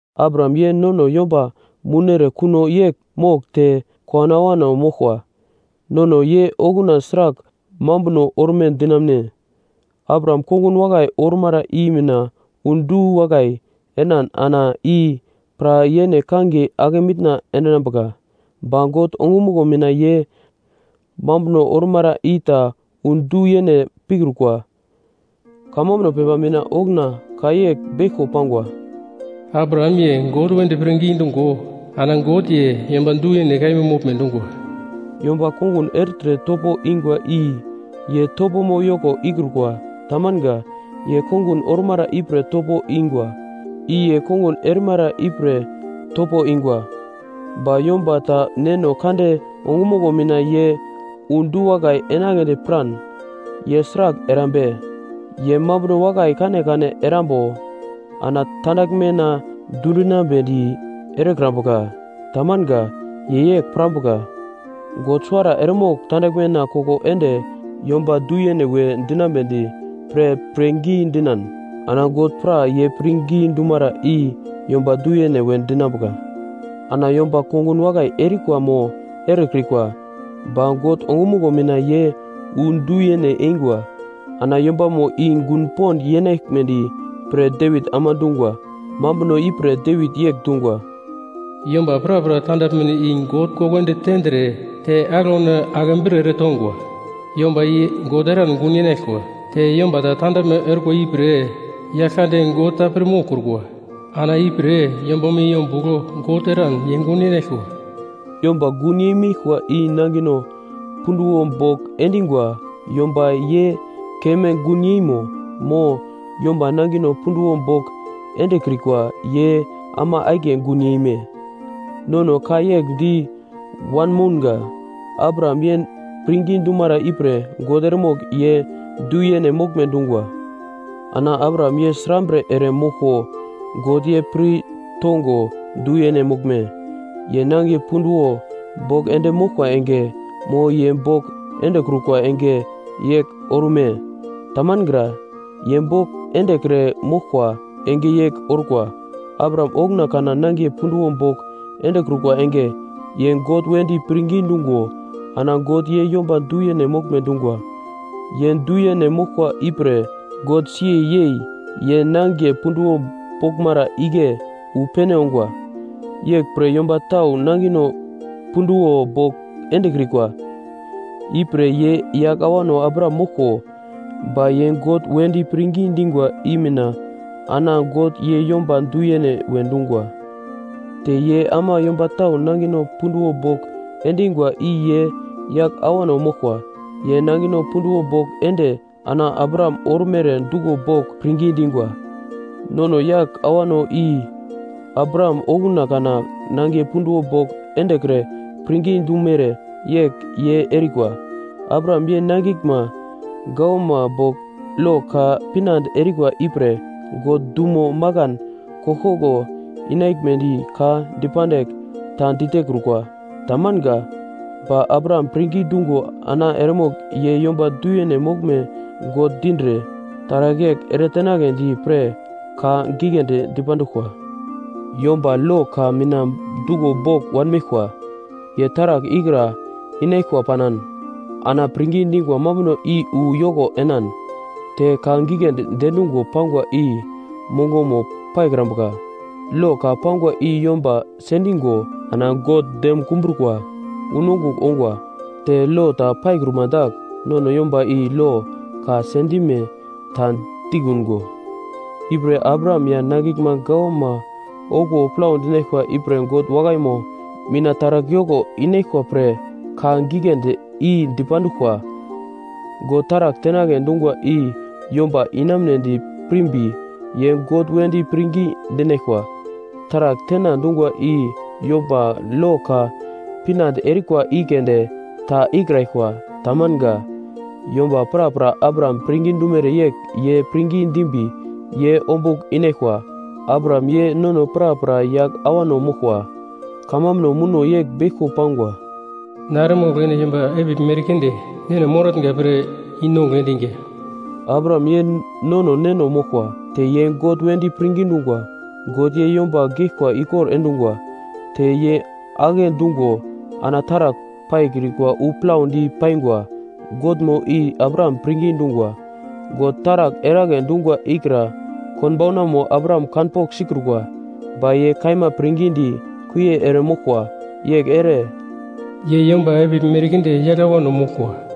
Abraham ye nono yomba mounere kuno yegl mogl te kowano awano moglkwa. Nono ye okuna sragl mambuno orme dinamune? Abraham kongun wakai ormara i mina wu du-wakai enan ana i pra yene kangiye ake mitna endinambuka. Ba God ongumuglo mina ye mambuno ormara i ta wu du-yene pikrukwa. Kamambuno pepa mina okuna ka yegl beglko pangwa, “Abraham, ye God wedi pirngi dungo ana God, ye yomba du-yene kaima moglme dungwa.” Yomba kongun ertre topo ingwa i ye topomo yoko ikrukwa, tamanga. Ye kongun ormara ipre topo ingwa. I ye kongun erimara ipre topo ingwa. Ba yomba ta Neno Kande ongumuglo mina ye wu du-wakai enagledi piran, ye sragl erambe? Ye mambuno wakai kanekane erimbo ana tandaglmena dundinambedi erekrambuka, tamanga. Ye yegl pirambuka: God suwara eremogl tandaglmena koko ende yomba du-yene we dinambedi pre pirngi dinan, ana God pra ye pirngi dumara i yomba du-yene we dinambuka. Ana yomba kongun wakai erikwa mo erekrikwa, ba God ongumuglo mina ye wu du-yene eingwa. Ana yombamo i gun pond yenaglimedi pre Devit ama dungwa. Mambuno ipre Devit yegl dungwa: “Yomba prapra tandaglmeno i God koko ende tendre, te aglauno ake bre eretongwa, yomba i God eran gun yenaglkwa. Te yomba ta tandaglme orkwa ipre Yaglkande God ta pir moglkrukwa, ana ipre yombamo i ombugl God eran ye gun yenaglkwa.” Yomba gun yeimeglkwa i nangino punduwo bogl endingwa yomba ye keme gun yeimo, mo yomba nangino punduwo bogl endekrikwa ye ama akiye gun yeme? Nono ka yegl di wanmounga: “Abraham ye pirngi dumara ipre God eremogl ye du-yene moglme dungwa.” Ana Abraham ye srambre ere moglko, God ye pir tongo du-yene moglme? Ye nangiye punduwo bogl ende moglkwa enge, mo ye bogl endekrukwa enge yegl orume? Tamangra, ye bogl endekre moglkwa enge yegl orkwa. Abraham okuna kana nangiye punduwo bogl endekrukwa enge, ye God wedi pirngi dungo, ana God ye yomba du-yene moglme dungwa. Ye du-yene moglkwa ipre God si yei ye nangiye punduwo boglmara igle wu pene ongwa. Yeglpre yomba tau nangino punduwo bogl endekrikwa, ipre ye yagl awano Abraham moglko, ba ye God wedi pirngi dingwa i mina ana God ye yomba du-yene we dungwa. Te ye ama yomba tau nangino punduwo bogl endingwa i ye yagl awano moglkwa. Ye nangino punduwo bogl ende ana Abraham ormere duglo bogl pirngi dingwa. Nono yagl awano i Abraham okuna kana nangiye punduwo bogl endekre pirngi dumere yegl ye erikwa. Abraham ya nangiglma gawama bogl lo ka pinande erikwa ipre God dumo makan koglkoglo inaglmedi ka dipandigl ta ditekrukwa, tamanga. Ba Abraham pirngi dungo ana eremogl ye yomba du-yene moglme God dindre taragl yegl eretenagledi pre ka giglendi dipanduglkwa. Yomba lo ka mina duglo bogl wanmeglkwa, ye taragl ikra inaglkwa panan, ana pirngi dingwa mambuno i wu yoko enan, te ka giglendi diendungo pangwa i mongomo paikrambuka. Lo ka pangwa i yomba sendingo ana God dem kumbrukwa unongugl ongwa, te lo ta paikruma dagl, nono yomba i lo ka sendime ta dikungo. Ipre Abraham ya nangiglma gawama okuwo plau dinaglkwa ipre God wakaimo mina taragl yoko inaglkwa pre ka giglendi i dipanduglkwa. God taragl tenagle dungwa i yomba inamunedi pirmbi, ye God wedi pirngi dinaglkwa. Taragl tena dungwa i yomba lo ka pinande erikwa i keunde ta ikraglkwa, tamanga. Yomba prapra Abraham pirngi dumere yegl ye pirngi dimbi ye ombugl inaglkwa. Abraham, ye nono prapra yagl awano moglkwa. Kamambuno muno yegl beglko pangwa: “Na, eremogl ene yomba epigl merkinde neno moratnga pre i-nongugl endiga.” Abraham, ye nono neno moglkwa, te ye God wedi pirngi dungwa. God ye yomba geglkwa ikor endungwa, te ye agle dungo ana taragl paikrikwa wu plaudi paingwa Godmo i Abraham pirngi dungwa. God taragl eragle dungwa ikra konbaunamo Abraham kanpogl sikrukwa, ba ye kaima pirngidi kuie ere moglkwa. Yegl ere “Ye yomba epigl merkinde yagl awano moglkwa.”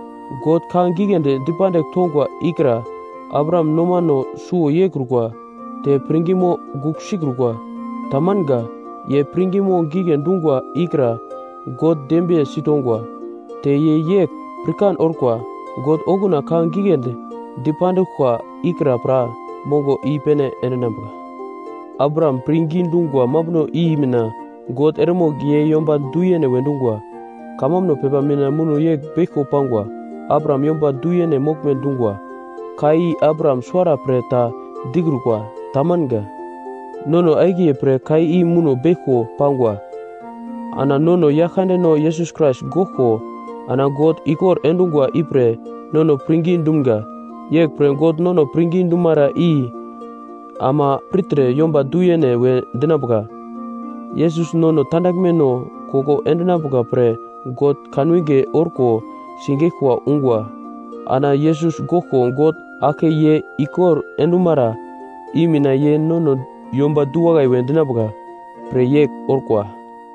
God ka giglendi dipandigl tongwa ikra Abraham nomano suwo yeikrukwa, te pirngimo gugl sikrukwa, tamanga. Ye pirngimo gigle dungwa ikra God dembiye sitongwa. Te ye yegl pirkan orkwa: “God okuna ka giglendi dipanduglkwa ikra pra mongomo i-pene endinambuka.” Abraham pirngi dungwa mambuno i mina “God eremogl ye yomba du-yene we dungwa.” Kamambuno pepa mina muno yegl beglko pangwa: “Abraham yomba du-yene moglme dungwa.” Ka i Abraham suwara pre ta dikrukwa, tamanga. Nono akiye pre ka i muno beglko pangwa. Ana nono Yaglkandeno Yesus Krais goglko ana God ikor endungwa ipre nono pirngi dumga. Yeglpre God nono pirngi dumara i ama pirtre yomba du-yene we dinambuka. Yesus nono tandaglmeno koko endinambuka pre God kanwinge orko sigeglkwa ungwa. Ana Yesus goglko God aglke ye ikor endumara i mina ye nono yomba du-wakai we dinambuka, pre yegl orkwa.